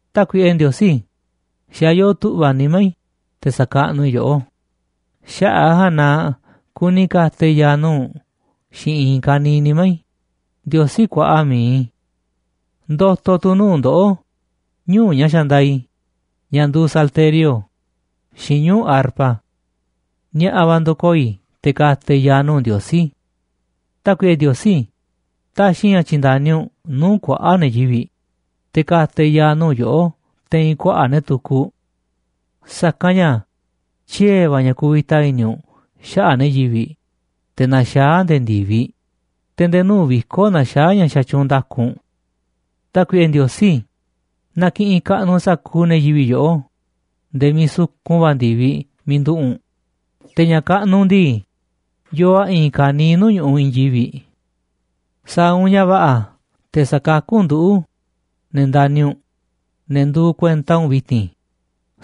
Tákuiꞌe Ndiosí, xa̱ yoo tu̱ꞌva̱ nimá i̱ te̱ sa̱kaꞌnuꞌ i̱ yoꞌó, xaꞌa̱ꞌ a̱ ja̱a̱nꞌ na kuni ka̱ta̱ i̱ ya̱a̱ nuu̱ꞌ u̱nꞌ xiinꞌ i̱i̱n ka̱niiꞌ nimá i̱, Ndiosí kuaꞌa mi̱iꞌ i̱. Ndo̱to̱ tu̱ nuu̱ꞌ ndoꞌó, ñuu̱ꞌ ña̱ xandaaꞌ i̱, ña̱ nduuꞌ salterio xiinꞌ ñuu̱ꞌ arpa. Ni̱a̱ꞌa̱ va̱ ndo̱koo̱ i̱ te̱ ka̱ta̱ i̱ ya̱a̱ nuu̱ꞌ Ndiosí. Tákuiꞌe Ndiosí, ta̱xi̱ i̱ ña̱ tyi̱nda̱ni u̱nꞌ nuu̱ꞌ kuaꞌa̱ꞌ ne̱ yivi̱ꞌ, te̱ ka̱ta̱ i̱ ya̱a̱ nuu̱ꞌ yoꞌó te̱i̱n kuaꞌa̱ꞌ ne̱ tukuꞌ. Sa̱kanꞌ ña̱ tyiee̱ va̱ ña̱ kuvita i̱ni̱ u̱nꞌ xaꞌa̱ꞌ ne̱ yivi̱ꞌ, te̱ naxaá a̱ nde̱e̱ ndi̱viꞌ, te̱ nde̱e̱ nuu̱ꞌ viko̱ꞌ naxaá ña̱ xatyuunꞌ nda̱ku u̱nꞌ. Tákuiꞌe Ndiosí, na ki̱ꞌi̱n kaꞌnuꞌ sa̱kuuꞌ ne̱ yivi̱ꞌ yoꞌó nde̱e̱ miiꞌ sukun va̱ ndi̱viꞌ miiꞌ nduꞌu̱ꞌ u̱nꞌ, te̱ ña̱ kaꞌnuꞌ u̱nꞌ ndii, yoo a̱ i̱i̱n ka̱niiꞌ nuu̱ꞌ ñu̱ꞌuꞌ i̱i̱n yivi̱ꞌ. Sa̱a̱ u̱nꞌ ña̱ va̱ꞌa̱ te̱ sakakú u̱nꞌ nduꞌu̱, ne̱ ndani̱ u̱nꞌ, ne̱ nduuꞌ kuenta u̱nꞌ vi̱ti̱n,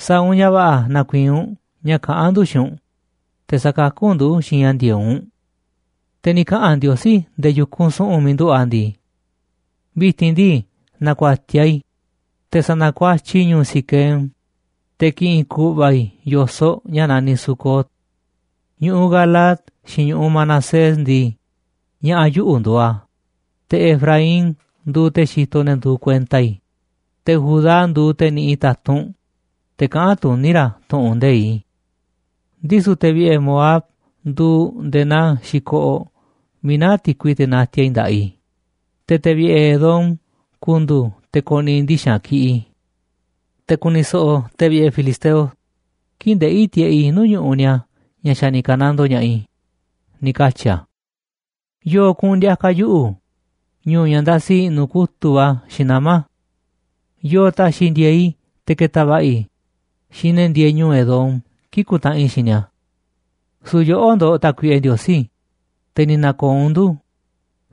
sa̱a̱ u̱nꞌ ña̱ va̱ꞌa̱ na̱ku̱i̱i̱n u̱nꞌ ña̱ kaꞌán ndu̱ xiinꞌ u̱nꞌ, te̱ sa̱kakú u̱nꞌ ndu̱ xiinꞌ ña̱ ndi̱e̱eꞌ u̱nꞌ. Te̱ ni̱ kaꞌa̱n Ndiosí nde̱e̱ yu̱kunꞌ su̱ꞌu̱n miiꞌ nduꞌu̱ꞌ a̱ ndii: “Vi̱ti̱n ndii, na̱ku̱a̱tiaꞌ i̱, te̱ sa̱na̱kuatyiꞌ i̱ ñu̱u̱ Siquem, te̱ ki̱ꞌi̱n ku̱ꞌva̱ i̱ yo̱soꞌ ña̱ naniꞌ Sucot. Ñu̱ꞌuꞌ Galaad xiinꞌ ñu̱ꞌuꞌ Manasés ndii, ña̱ꞌa̱ yuꞌu̱ nduuꞌ a̱, te̱ Efraín nduuꞌ te̱ xitoꞌ ne̱ nduuꞌ kuenta i̱, te̱ Judá nduuꞌ te̱ niꞌiꞌ ta̱tunꞌ, te̱ kaꞌán tuní ra̱ tu̱ꞌu̱n nde̱iꞌ i̱. Ndisu̱ te̱ vi̱ꞌe̱ Moab nduuꞌ nde̱e̱ naa xi̱koꞌoꞌ miiꞌ naá ti̱kui teꞌ natiaꞌ i̱ nda̱ꞌaꞌ i̱, te̱ te̱ vi̱ꞌe̱ Edom ku̱ndu̱u̱ te̱ ko̱ni̱ꞌi̱ ndixa̱nꞌ kiꞌiꞌ i̱. Te̱ ku̱ni̱ so̱ꞌo̱ ne̱ vi̱ꞌe̱ filisteo kii̱ꞌ ndeꞌi̱ tiꞌeꞌ i̱ nuu̱ꞌ ñu̱ꞌuꞌ ni̱a̱ ña̱ xa̱ ni̱ ka̱nandoo ña̱ꞌaꞌ i̱”, ni̱ katyi̱ a̱. ¿Yo̱o̱ kuꞌu̱n ndi̱a̱ka̱ yuꞌu̱ ñu̱u̱ ña̱ ndasi i̱ꞌnu̱ kutu̱ꞌ va̱ xiinꞌ nama̱? ¿Yo̱o̱ ta̱xi̱ ndi̱e̱e̱ꞌ i̱ te̱ ke̱ta̱ va̱ꞌa̱ i̱ xiinꞌ ne̱ ndieeꞌ ñu̱u̱ Edom kii̱ꞌ ku̱ntaꞌanꞌ i̱ xiinꞌ ni̱a̱? Su̱u̱ yoꞌó ndo̱ꞌ, Tákuiꞌe Ndiosí, te̱ ni̱ na̱ko̱o̱ u̱nꞌ ndu̱,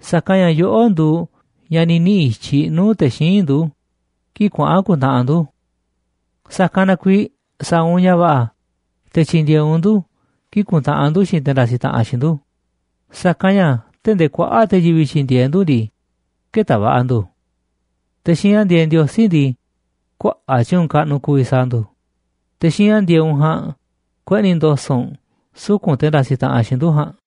sa̱kanꞌ ña̱ yoꞌó nduuꞌ ña̱ ni̱ niꞌi̱ i̱tyiꞌ nuu̱ꞌ te̱ xíinꞌ ndu̱ kii̱ꞌ kuaꞌa̱n ku̱ntaꞌanꞌ ndu̱. Sa̱kanꞌ na kuiiꞌ sa̱a̱ u̱nꞌ ña̱ va̱ꞌa̱ te̱ tyi̱ndi̱e̱eꞌ u̱nꞌ ndu̱ kii̱ꞌ ku̱ntaꞌanꞌ ndu̱ xiinꞌ te̱ ndasiꞌ taꞌanꞌ xiinꞌ ndu̱, sa̱kanꞌ ña̱ tee̱ꞌ ndee kuaꞌa̱ꞌ te̱ yivi̱ꞌ tyi̱ndi̱e̱eꞌ ndu̱ ndii, kë̱ta̱ va̱ꞌa̱ ndu̱. Te̱ xiinꞌ ña̱ ndi̱e̱eꞌ Ndiosí ndii, kuaꞌa̱ꞌ tyu̱u̱n kaꞌnuꞌ ku̱vi̱ sa̱a̱ ndu̱. Te̱ xiinꞌ ña̱ ndi̱e̱eꞌ u̱nꞌ ja̱a̱nꞌ kueꞌni̱ ndo̱so̱ꞌ u̱nꞌ suku̱nꞌ te̱ ndasiꞌ taꞌanꞌ xiinꞌ ndu̱ ja̱a̱nꞌ.